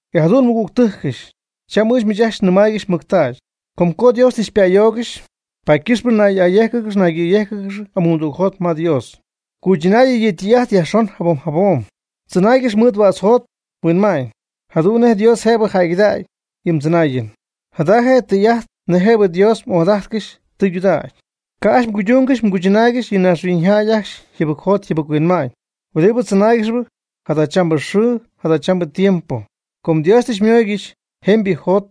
E jadu'n nmɨgügtɨjcɨch, cham ɨɨch miich ajcxy nɨmaaygɨxy mɨctägy, com co Dios tɨ xypa'ayoogɨxy, paady ycɨxpɨ nay'ayéjcɨgɨx naygɨ̈yéjcɨgɨx amuumdügjot ma Dios. Cuychɨnayɨ yɨ ytɨy'ajt yajxon jabom jabom. Tzɨnaaygɨx mɨɨd huädz mjot mhuinma'ñ, jadu'n nej Dios jëbɨ jäygɨdägy yɨ mdzɨnaayɨn. Jada je tɨy'ajt nej jëbɨ Dios m'ojadajtcɨxy tɨydudägy. Ca' ajcxy mguydungɨxy mguychɨnaaygɨxy yɨ naaxhuiñyjäy ajcxy yjɨbɨcjot yjɨbɨc-huinma'ñ huɨdibɨ tzɨnaaygɨxp jadachambɨ xɨɨ jadachambɨ tiempo. Com Dios tɨ xymooygɨxy jemybɨ mjot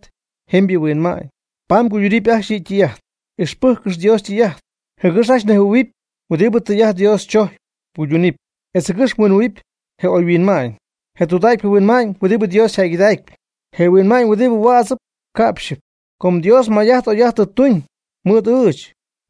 jemybɨ mhuinma'ñ, paady mguydunɨpy ajcxy yɨ' ytɨy'ajt. Ixpɨjccɨx Dios ytɨy'ajt, jɨgɨx ajcxy mnejhuɨ̈huɨpy huɨdibɨ tɨy'ajt Dios chojcyp mguydunɨpy, etz jɨgɨx mhuinjɨhuɨ̈huɨpy je oyhuinma'ñ, je tudägypɨ huinma'ñ huɨdibɨ Dios yjäygɨdacpy, je huinma'ñ huɨdi huädzɨp ca'pxyɨp. Com Dios may'ajt oy'ajt tɨ tuñ mɨɨd ɨɨch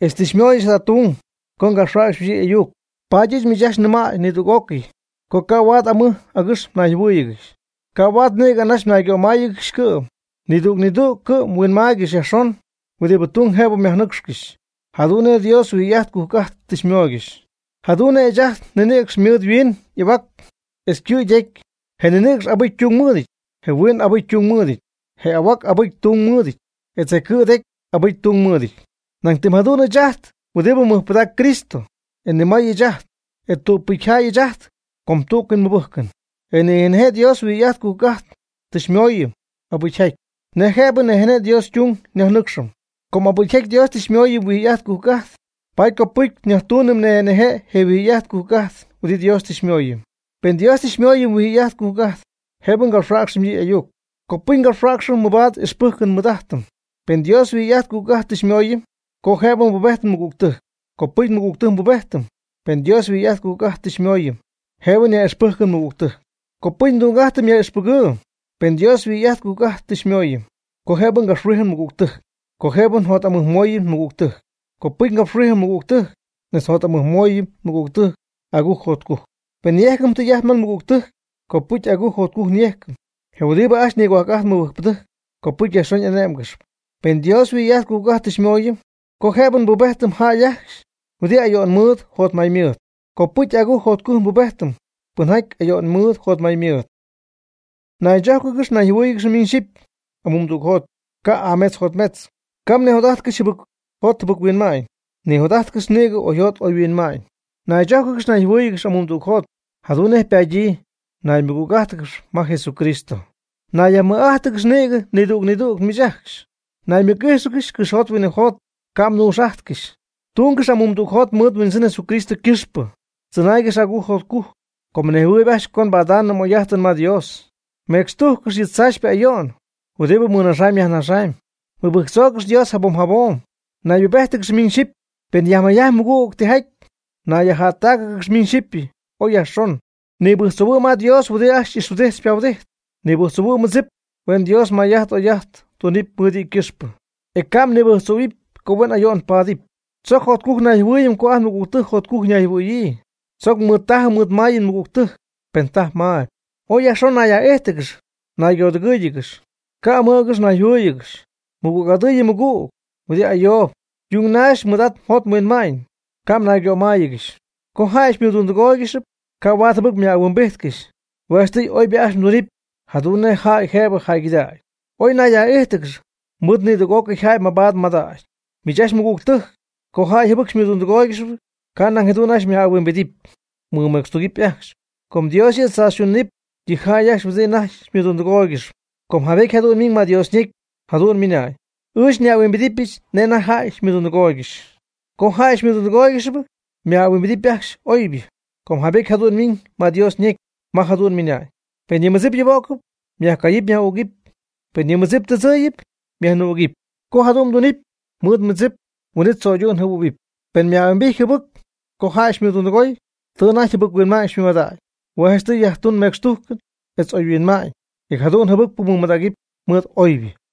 etz tɨ xymöyɨch jada tung co ngapxhuäcxɨch yɨ' y'ayuc, paady ɨɨch miich ajcxy nɨmäy nidüg'ócɨy co ca' huaad amɨj agɨx mnayjɨhuɨ́ɨyɨgɨxy, ca' huaad nïgɨ anaxy mnaygömáayɨgɨxy cɨ'm. Nidüg nidüg cɨ'm huinmaaygɨxy yajxon huɨdi tung jëbɨ myajnɨcxcɨxy, jadu'n nej Dios huijy'ajt cujc'ajt tɨ xymooygɨxy. Jadu'n nej ɨɨch ajt nninïcx ymɨɨd yhuin y'ahuac etz ycɨ' ytecy, je ninïcx abɨcy ytung mɨɨdɨty, je huiin abɨcy ytung mɨɨdɨty, je y'ahuac abɨcy ytung mɨɨdɨty, etz je cɨ' tecy abɨcy ytung mɨɨdɨty. Nañ tɨm jadu'n ɨɨch ajt huɨdi mɨjpɨdacp Cristo, e ni may ɨɨch ajt, e tügpɨcy jäy ɨɨch ajt com tú'cɨy nmɨbɨjcɨm. E nije' nije' Dios huijy'ajt cujc'ajt tɨ xymooyɨm abɨcyjaty, nej jëbɨ nije' nije' Dios ytung nyajnɨcxɨm. Com abɨcyjaty Dios tɨ xymooyɨm huijy'ajt cujc'ajt, paady copɨcy nyajtuunɨm nije' nije' je huijy'ajt cujc'ajt huɨdi Dios tɨ xymooyɨm. Pen Dios tɨ xymooyɨm huijy'ajt cujc'ajt jëbɨ ngapxhuäcxɨm yɨ' y'ayuc, copɨcy ngapxhuäcxɨm mɨbaad ixpɨjcɨn nmɨɨd'ajtɨm. Pen Dios huijy'ajt cujc'ajt tɨ xymooyɨm co jëbɨ nbubejtɨm nmɨgügtɨjc, copɨcy nmɨgügtɨjc nbubejtɨm. Pen Dios huijy'ajt cujc'ajt tɨ xymooyɨm jëbɨ nyaj'ixpɨjcɨm nmɨgügtɨjc, copɨcy ndung'ajtɨm yaj'ixpɨgɨɨ. Pen Dios huijy'ajt cujc'ajt tɨ xymooyɨm co jëbɨ ngapxhuijɨm nmɨgügtɨjc, co jëbɨ njot'amɨjmooyɨm nmɨgügtɨjc, copɨcy ngapxhuijɨm nmɨgügtɨjc, etz njot'amɨjmooyɨm nmɨgügtɨjc agujc jotcujc. Pen nyejcɨm tijaty ma nmɨgügtɨjc, copɨcy agujc jotcujc nyejcɨm. Je huɨdi ajcxy nigohuajc'ajtp mɨbɨjcpɨdɨjc copɨcy yajxon y'ané'mgɨxɨpy. Pen Dios huijy'ajt cujc'ajt tɨ xymooyɨm co jëbɨ nbubejtɨm jäy ajcxy huɨdibɨ ayo'n mɨɨd jotmay mɨɨd, copɨcy agujc jotcujc nbubejtɨm pɨnjaty ayo'n mɨɨd jotmay mɨɨd. Naychójcɨgɨxy nayjɨhuɨ́ɨyɨgɨxy miñ xyɨpy amuumdügjot, ca' y'ametz yjotmetzɨty. Ca' mnijot'ajtcɨxy jɨbɨc jot jɨbɨc-huinma'ñ. Nijot'ajtcɨx nïgɨ oyjot oyhuinma'ñ. Naychójcɨgɨx nayjɨhuɨ́ɨyɨgɨx amuumdügjot, jadu'n nej ypadyii mnaymɨgüg'ájtɨgɨxɨpy ma Jesucristo. Nayyajmɨj'ájtɨgɨx nïgɨ nidüg nidüg miich ajcxy. Naymɨc'íjxɨgɨx cɨxyjot huinɨjot, ca' mnuux'ajtcɨx. Tungɨx amuumdügjot mɨɨd mHuindzɨn Jesucristo ycɨxpɨ. Tzɨnaaygɨx agujc jotcujc, com mnejhuɨɨyb ajcxy co mbada'ñ oy'ajtɨn ma Dios. Mecxtujccɨx yɨ tzaachypɨ ayo'n huɨdibɨ mmɨnajxyp myajnajxyp. Mɨbɨjctzoogɨx Dios jabom jabom. Naybubéjtɨgɨx miñ xyɨpy, pen yajmayjajtpy mɨgüg tijaty. Nayyajjättácɨgɨx miñ xyɨpy oy yajxon. Nibɨjctzohuɨ' ma Dios huɨdibɨ ajcxy xy'ixhuɨdijtp xypahuɨdijtp. Nibɨjctzohuɨ' mmɨdzip huen Dios may'ajt oy'ajt tuñ mɨɨd yɨ' ycɨxpɨ. E ca' mnibɨjctzohuɨ̈y co huen ayo'n paadɨpy. Tzoc jotcujc nayjɨhuɨɨyɨm co ajt nmɨgügtɨjc jotcujc ñayjɨhuɨ̈yii. Tzoc mɨɨdtajɨm mɨɨdmayɨm nmɨgügtɨjc pen tajp mayb. Ooy yajxon nayyaj'íjtɨgɨx naygodɨgɨ́ɨyɨgɨx. Ca' amɨj agɨx mnayjɨhuɨ́ɨyɨgɨxy. Mɨgüg'adɨɨyb yɨ mmɨgüg huɨdi ayoob. Yung naxy mɨɨd'at mjot mhuinma'ñ, ca' mnaygömáayɨgɨxy. Co jäy xymɨdundɨgóoygɨxɨpy, ca' huaad jɨbɨc myaj'ahuimbijtcɨxy. Hue' janchtɨy oybɨ ajcxy mdunɨpy jadu'n nej jäy jëbɨ jäygɨdägy. Oy nayyaj'íjtɨgɨx mɨɨd nidüg'ócɨy jäy mabaad mmadägy. Miich ajcxy mɨgügtɨjc, co jäy jɨbɨc xymɨdundɨgóoygɨxɨpy, ca' nañ jadu'n ajcxy myaj'ahuimbidɨpy, mɨmecxtugɨpy ajcxy, com Dios yɨ' tzaachytunɨp yɨ jäy ajcxy huɨdi anajty xymɨdundɨgóoygɨxp. Com jaybety jadu'n ymiñ ma Dios ñecy jadu'n ymɨnañ: “Ɨɨch nyaj'ahuimbidɨpyɨch nej anajty jäy xymɨdundɨgooygɨxy.” Co jäy xymɨdundɨgóoygɨxɨpy myaj'ahuimbidɨpy ajcxy oybɨ, com jaybety jadu'n ymiiñ ma Dios ñecy, ma jadu'n ymɨna'ñ: Pen yɨ mmɨdzip yubo'cɨp, myajcayɨpy myaj'ügɨpy, pen yɨ mmɨdzip tɨdzɨɨyɨp, myajnɨɨ'ügɨpy. Co jadu'n mdunɨpy mɨɨd mmɨdzip huin'it tzöydu'n jɨhuɨ̈huɨpy. Pen myaj'ahuimbijtpy jɨbɨc co jäy xymɨdundɨgoy, tɨ anajty jɨbɨc-huinma'ñ xymɨmadägy. Hue' janchtɨy yajtun mecxtujcɨn etz oyhuinma'ñ, e jadu'n jɨbɨcpɨ mɨmadägɨpy mɨɨd oybɨ.